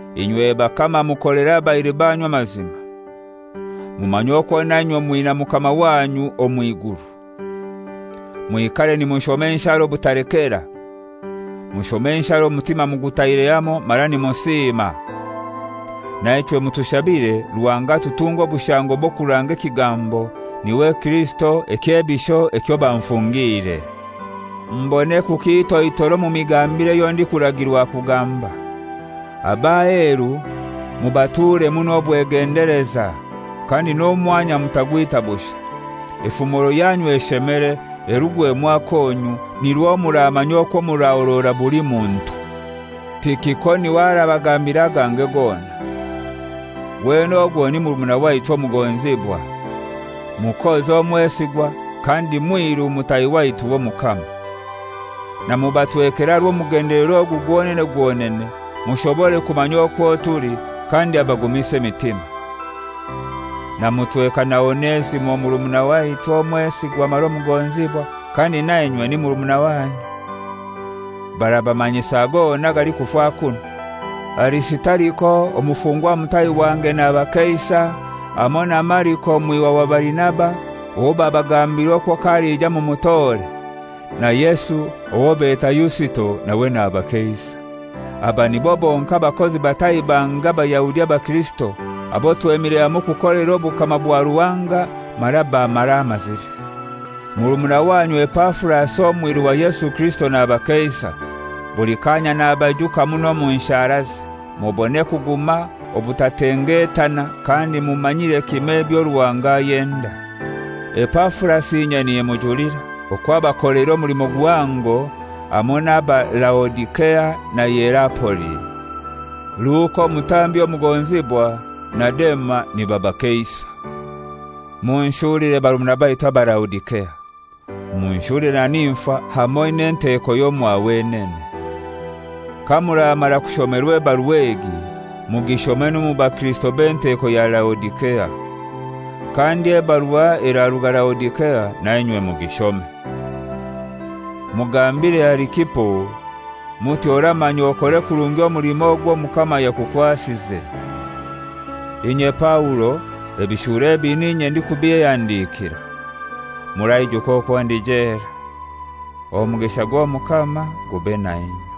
Inywe bakama mukolere abairu banyu amazima. Mumanye okwo nainywe mwina Mukama wanyu omw'iguru. Mwikare nimushoma enshara obutalekera. Mushome enshara omutima mugutaire hamoi mara nimusima. Naichwe mutushabire Ruhanga atutunge obushango bw'okuranga ekigambo, niwe Kirisito ekyebisho ekyo banfungiire, mbone kukitoitora omu migambire eyo ndikuragirwa kugamba. Ab'aheru mubaturemu n'obwegendeleza, kandi n'omwanya mutagwita bushai. Efumoro yanyu eshemere, erungwemu akonyu, nirwo muramanya okwo murahorora buli muntu. Tikiko niwe arabagambira agange gona. Wenene ogwo ni murumuna waitu omugonzibwa, mukozi mwesigwa kandi mwiru mutahi waitu w'Omukama. Namubatwekera aha rw'omugendelero ogu gwonene gwonene, mushobore kumanya okwo tuli, kandi abagumise emitima. Namutweka na Onesimo murumuna waitu omwesigwa mara omugonzibwa, kandi nainywe ni murumuna wanyu. Barabamanyisa gona agalikufa kunu. Arisitariko, omufungwa mutahi wange nabakeisa, hamoi na Mariko mwihwa wa Barinaba (owo babagambiire okwo k'alija mumutore), na Yesu owo beta Yusito nawe nabakeisa. Aba nibo bonkai abakozi batahi bange Abayahudi abakirisito, abo twemire hamoi kukolera obukama bwa Ruhanga mara bammaramazire. Murumuna wanyu Epafurasi, omwiru wa Yesu Kirisito, nabakeisa, buli kanya nabaijuka muno omu nsharaze, mubone kuguma obutatengetana kandi mumanyire kimoi ebyo Ruhanga ayenda. Epafurasi inye nimujulira okwo abakoleire omulimo guhango hamoi n'aba Laodisea na Hierapoli. Luka, omutambi omugonzibwa, na Dema nibabakeisa. Munshulire barumuna baitu aba Laodisea, munshulire na Nimfa hamoi n'enteko y'omwa wenene. Kamuramara kushomerwa ebarua egi mugishome n'omu bakirisito b'enteko ya Laodisea. Kandi ebarua eraruga Laodisea nainywe mugishome. Mugambire Arikipo muti, «Oramanya okore kurungi omulimo ogwo Omukama yakukwasize.» Inye Paulo, ebishuro ebi n'inye ndikubyehandikira Muraijuka okwo ndi jela. Omugisha gw'Omukama gube na inywe.